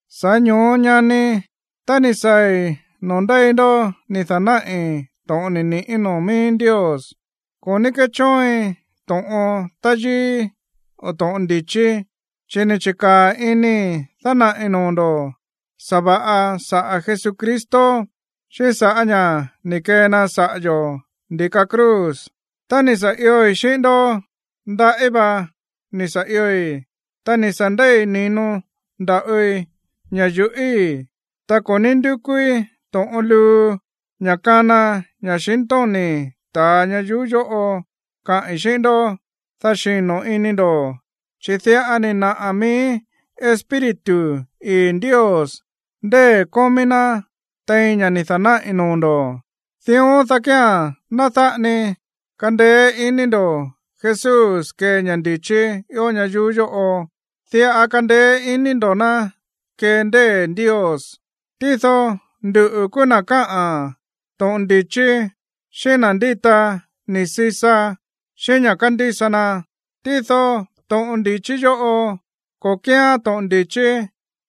Sa̱ꞌá ño̱ó, ñani, tá ni̱ saa̱i̱ noo̱ ndéi ndó ni̱ da̱náꞌi̱ to̱ꞌon ni̱ ni̱ꞌí noo̱ mií Ndios, ko̱ ní kéchóoin to̱ꞌon táyíí o to̱ꞌon ndi̱chí. Chi̱ ni̱ chi̱kaa̱ inii̱ dánaꞌi̱ noo̱ ndo̱ sa̱va̱ꞌa saꞌa̱ Jesucristo, xíꞌín sa̱ꞌá ña̱ ni̱ kee na saꞌa̱ yo̱ ndi̱ka cruz. Tá ni̱ sa̱ ioi̱ xíꞌín ndó, ndaꞌí va ni̱ sa̱ ioi̱, ta ni̱ sa̱ ndei̱ ni̱no nda̱ꞌoi ña̱ yuꞌíi̱. Ta ko̱ ní ndúkúí to̱ꞌon luu, ña̱ kána ña̱xintóni̱ ta̱a ñayuú yóꞌo kaꞌi̱n xíꞌín ndó, dá xino̱ ini ndo̱. Chi̱ diꞌa ni̱ naꞌa̱ mií Espíritu ii̱ Ndios ndée̱ kómí ná tein ña̱ ni̱ da̱náꞌi̱ noo̱ ndo̱. Dión dá kía̱n ná dáꞌa ni kandeé iní ndo̱ Jesús kee ña̱ ndi̱chí ió ñayuú yóꞌo, diꞌa kandeé iní ndo̱ ná kee ndée̱ Ndios. Tído nduꞌu̱ kúú na̱ káꞌa̱n to̱ꞌon ndi̱chí xíꞌín na̱ ndíta ni̱ sisa xíꞌín ña̱ kándísa na, tído to̱ꞌon ndi̱chí yóꞌo, ko̱ kíán to̱ꞌon ndi̱chí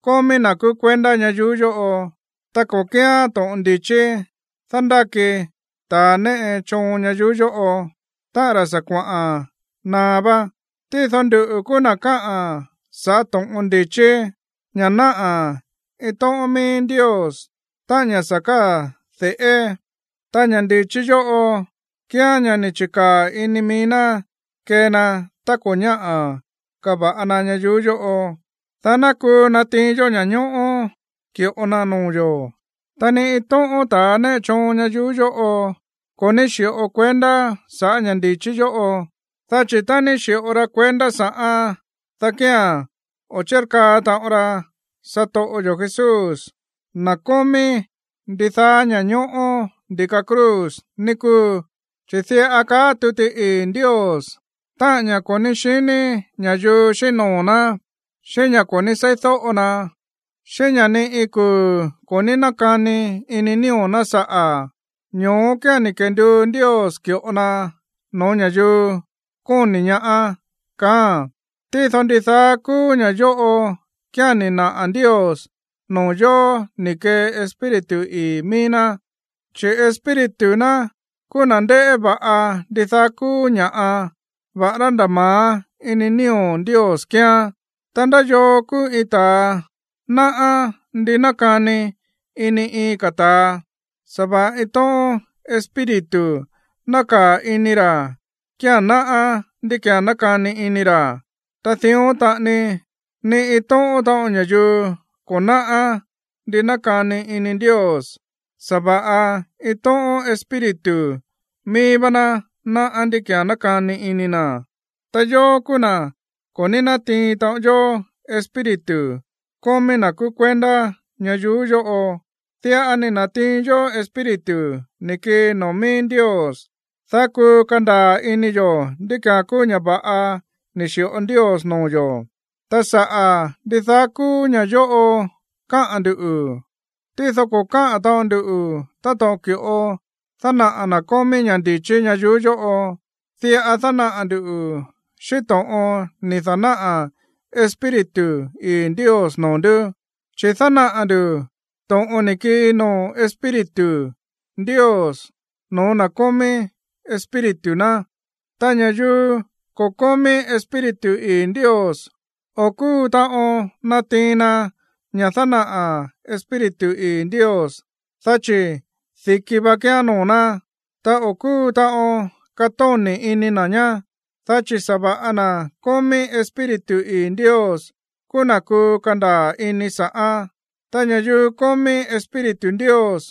kómí na̱ kúú kuendá ñayuú yóꞌo, ta ko̱ kíán to̱ꞌon ndi̱chí dándáki ta̱a néꞌe choon ñayuú yóꞌo, táꞌa̱n ra̱ sa̱ kuaꞌa̱n naá vá. Tído nduꞌu̱ kúú na̱ káꞌa̱n saꞌa̱ to̱ꞌon ndi̱chí, ña̱ náꞌá iin tóꞌón míí Ndios, táꞌa̱n ña̱ sa̱ káa̱ de̱ꞌé. Ta ña̱ ndi̱chí yóꞌo kíán ña̱ ni̱ chi̱kaa̱ ini mií ná kee na tá ko̱ ñáꞌa̱ kava̱ꞌa na ñayuú yóꞌo, dá ná kuu natiin yó ña̱ñóꞌó ki̱ꞌo na noo̱ yo̱. Ta ni iin tóꞌón ta̱a néꞌe choon ñayuú yóꞌo ko̱ ní xi̱ꞌo kuendá sa̱ꞌá ña̱ ndi̱chí yóꞌo, dá chi̱ tá ni̱ xi̱ꞌo ra kuendá sa̱ꞌán, dá kía̱n o̱ chírkaa taꞌon ra satoꞌo yo̱ Jesús, na̱ kómí ndidaá ña̱ñóꞌó, ndi̱ka cruz, ní kúu. Chi̱ diꞌa káꞌa̱n tuti ii̱ Ndios: Táꞌa̱n ña̱ꞌa ko̱ ní xiní ña̱yuu xíꞌín noo̱ ná, xíꞌín ña̱ ko̱ ní seídóꞌo na, xíꞌín ña̱ ni iin kuu̱ ko̱ ní nákani ini nío̱ ná saꞌa̱, ño̱ó kía̱n ni̱ kenduu Ndios ki̱ꞌo na no̱ó ña̱yuu kóni̱ ñaá. Tído ndidaá kúú ña̱ yóꞌo kía̱n ni̱ naꞌa̱ Ndios noo̱ yo̱ ni̱ kee Espíritu ii̱ míí ná. Chi̱ Espíritu ná kúú na̱ ndéꞌé va̱ꞌa ndidaá kúú ña̱ꞌa, va̱ꞌará nda̱ ma̱á ini nío̱ Ndios kíán. Ta, ¿ndá yoo kúú iin ta̱a náꞌá ndi nákani ini iin ka̱ ta̱a? Sa̱va̱ꞌa iin tóꞌón espíritu nákaa̱ ini ra̱ kía̱n náꞌá ndí ki̱án nákani ini ra̱. Ta dión taꞌani, ni iin tóꞌón taꞌon ña̱yuu ko̱ náꞌá ndi nákani ini Ndios, sa̱va̱ꞌa iin tóꞌón Espíritu mií vá ná náꞌá ndí ki̱án nákani ini na̱. Ta yóó kúú na̱ ko̱ ní nátiin taꞌon yó espíritu kómí na̱ kúú kuendá ñayuú yóꞌo. Diꞌa ni̱ na̱tiin yó Espíritu ni̱ kii noo̱ míí Ndios, dá kuu kandaa̱ ini yo̱ ndí ki̱án kúú ña̱ va̱ꞌa ni̱ xi̱ꞌo Ndios noo̱ yo̱. Ta saꞌa̱ ndidaá kúú ña̱ꞌa yóꞌo káꞌa̱n ndu̱, tído ko̱ káꞌa̱n taꞌon ndu táto̱ꞌon ki̱ꞌo dánaꞌa̱ na̱ kómí ña̱ ndi̱chí ñayuú yóꞌo. Diꞌa dánaꞌa̱ ndu̱ xíꞌín to̱ꞌon ni̱ da̱náꞌa̱ Espíritu ii̱ Ndios noo̱ ndú, chi̱ dánaꞌa̱ ndu̱ to̱ꞌon ni̱ kii noo̱ Espíritu Ndios no̱ó na̱ kómí Espíritu ná. Ta ña̱yuu ko̱ kómí Espíritu ii̱ Ndios, o̱ kúu taꞌon natiin na ña̱ dánaꞌa̱ Espíritu ii̱ Ndios, dá chi̱ di̱ki va kíán noo̱ ná. Ta o̱ kúu taꞌon katóni̱ ini na̱ ñá. Dá chi̱ sa̱va̱ꞌa na̱ kómí Espíritu ii̱ Ndios kúú na̱ kuu kandaa̱ ini sa̱ꞌán. Ta ña̱yuu kómí Espíritu Ndios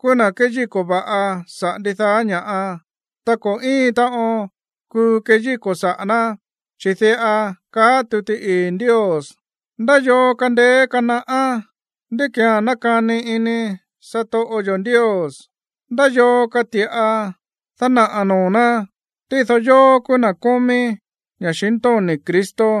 kúú na̱ kéyíko̱ va̱ꞌa saꞌa̱ ndidaá ña̱ꞌa, ta ko̱ íin taꞌon kuu keyíko̱ saꞌa̱ ná. Chi̱ diꞌa kaá tuti ii̱ Ndios: “¿Ndá yoo kandeé kanaꞌá ndí ki̱án nákani ini satoꞌo yo̱ Ndios? ¿Ndá yoo kati̱ꞌa dánaꞌa̱ noo̱ ná?” Tído yóó kúú na̱ kómí ña̱xintóni̱ Cristo.